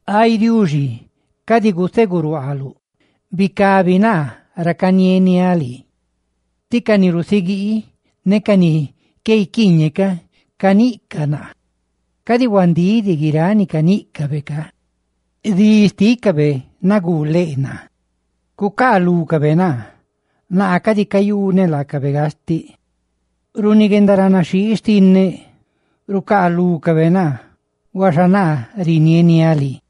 Ay Diuxi, cadi guseguruaaluꞌ bicabi naa ra canieniáꞌ lii, tí ca ni rusiguii ne ca ni qué guiquiiñeꞌ ca caniꞌcaꞌ naa, cadi huandíꞌ diꞌ guiráꞌ ni caníꞌcabe ca. Dí xtícabe naguu leꞌ naa; ¡cucaalúcabe naa, naa cadi cayuneꞌ laacabe gastiꞌ! Runi guendaranaxhii xtinneꞌ, rucaalúcabe naa; huaxa naa rinieniáꞌ lii.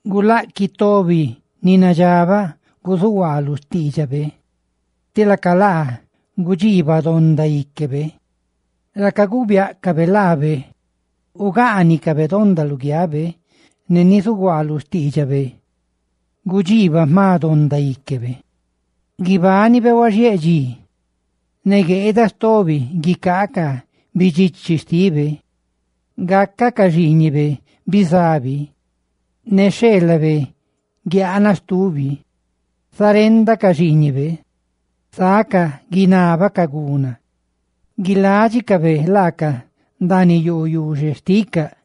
Gulaꞌquiꞌ tobi ni nadxabaꞌ guzuhuaa lu xtiidxabe, ti laca laa gudxiibaꞌ donda íquebe; ra caguu biáꞌcabe laabe ugaanicabe donda luguiabe; ne ni zuguaa lu xtiidxabe, gudxiibaꞌ jma donda íquebe. ¡Guibánibe huaxiéꞌ dxi, ne gueeda stobi guicaa ca bidxichi xtibe! ¡Gácacaꞌ ca xiiñibe bizabi ne xheelabe guiaanaꞌ stubi! ¡Sá renda ca xiiñibe, sacaꞌ guinábacaꞌ guna! ¡Guiládxicabe laacaꞌ ndaaniꞌ yoo yuxe xticaꞌ!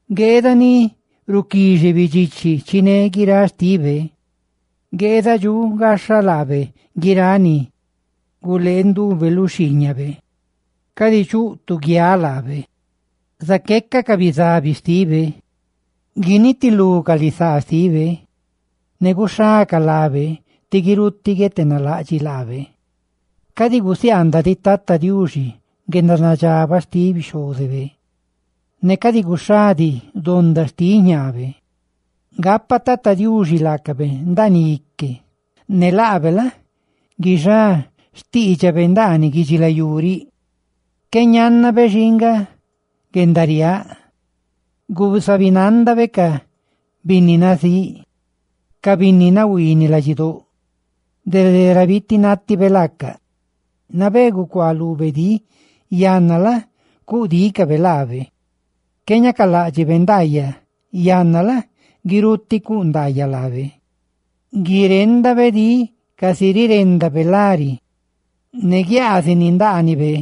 Gueeda ni ruquixe bidxichi chiné guiráꞌ xtibe. Gueeda dxuꞌ gaxha laabe guiráꞌ ni gulee ndube lu xhiiñabe. Cadi chuꞌ tu guiaꞌ laabe zaqueca ca bizabi xtibe. Guinitilú ca lisaa xtibe, ne guixá ca lábe, tí guirutiꞌ guietenalaꞌdxiꞌ laabe. Cadi gusiaandaꞌ diꞌ Tata Diuxi guendanadxabaꞌ xtiꞌ bixhózebe ne cadi guxhá diꞌ donda xtiꞌ jñaabe; gapa Tata Diuxi laacabe ndaaniꞌ ique, ne laabe la? guixá xtiidxabe ndaaniꞌ guidxilayú riꞌ. Qué ñánnabe xii nga guendariáꞌ; guzabinandabe ca binni nazíꞌ ne ca binni nahuiiniꞌ ladxidóꞌ dede ra bitinátibe laacaꞌ. Nabé gucuá lube dí, yanna la? ¡cuꞌ dícabe laabe! Qué ñacaláꞌdxibe ndaayaꞌ, yanna la? ¡guirutiꞌ cuꞌ ndaayaꞌ laabe! Guiréndabe dí casi riréndabe lari; ne guiaazini ndaanibe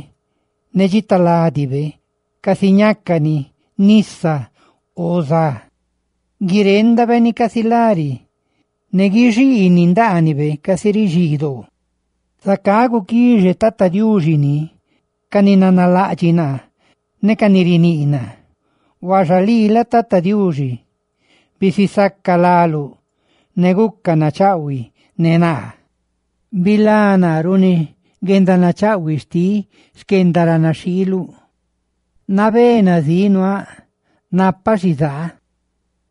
ne dxitaladibe casi ñácani nisa o za; ¡guiréndabe ni casi lari, ne guixiini ndaanibe casi rixii doo! ¡Zacá guquixe Tata Diuxi ni ca ni nanalaꞌdxiꞌ naa ne ca ni riníꞌ naa! Huaxa lii la? Tata Diuxi, bisisaca láluꞌ, ne guca nachaꞌhuiꞌ ne naa. ¡Bilá naa runi guendanachaꞌhuiꞌ xtiꞌ xquendaranaxhiiluꞌ! Nabé nazíꞌ nuaaꞌ, napaꞌ xizaa,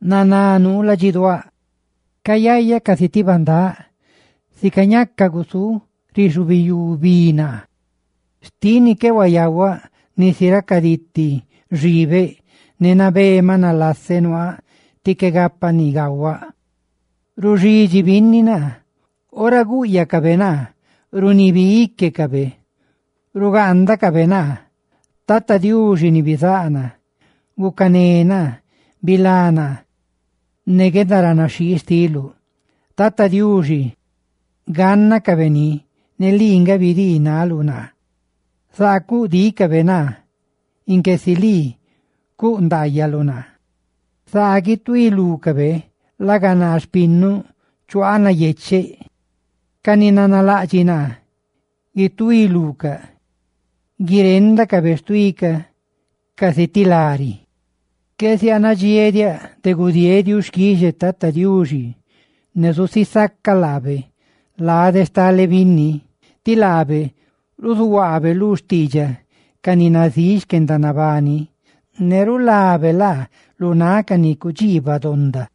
naná nuu ladxiduáꞌ. Cayayaꞌ casi ti bandáꞌ, ¡sica ñacaꞌ gusúꞌ rixubiyú bi naa! Xtiꞌ ni qué huayahuaꞌ nisi racaditi xibeꞌ; ne nabé maꞌ nalaseꞌ nuaaꞌ tí qué gapaꞌ ni gahuaꞌ. ¡Ruxidxi binni naa! ¡Ora gúꞌyacabe naa, runiibi íquecabe, rugaandacabe naa! Tata Diuxi ni bizáꞌ naa, gucané naa; ¡bilá naa ne guendaranaxhii xtiluꞌ! Tata Diuxi, gánnacabe ni, lii nga bidii naluꞌ naa. Zaa cuꞌ dícabe naa inque si lii cuꞌ ndaayaluꞌ naa. Zaa guituí lúcabe laga naa, xpinnuꞌ, chuaaꞌ nayecheꞌ. ¡Ca ni nanalaꞌdxiꞌ naa, guituí lucaꞌ! ¡Guiréndacabe xtuí ca casi ti lari! Qué zianadxiéꞌ diaꞌ de gudieeꞌ xquixe Tata Diuxi; ¡ne zusisacaꞌ laabe lade stale binni! Ti laabe ruzuhuaabe lu xtiidxaꞌ ca ni nazíꞌ xquendanabani, ne rulabe laacaꞌ lu náꞌ ca ni cudxiibaꞌ donda.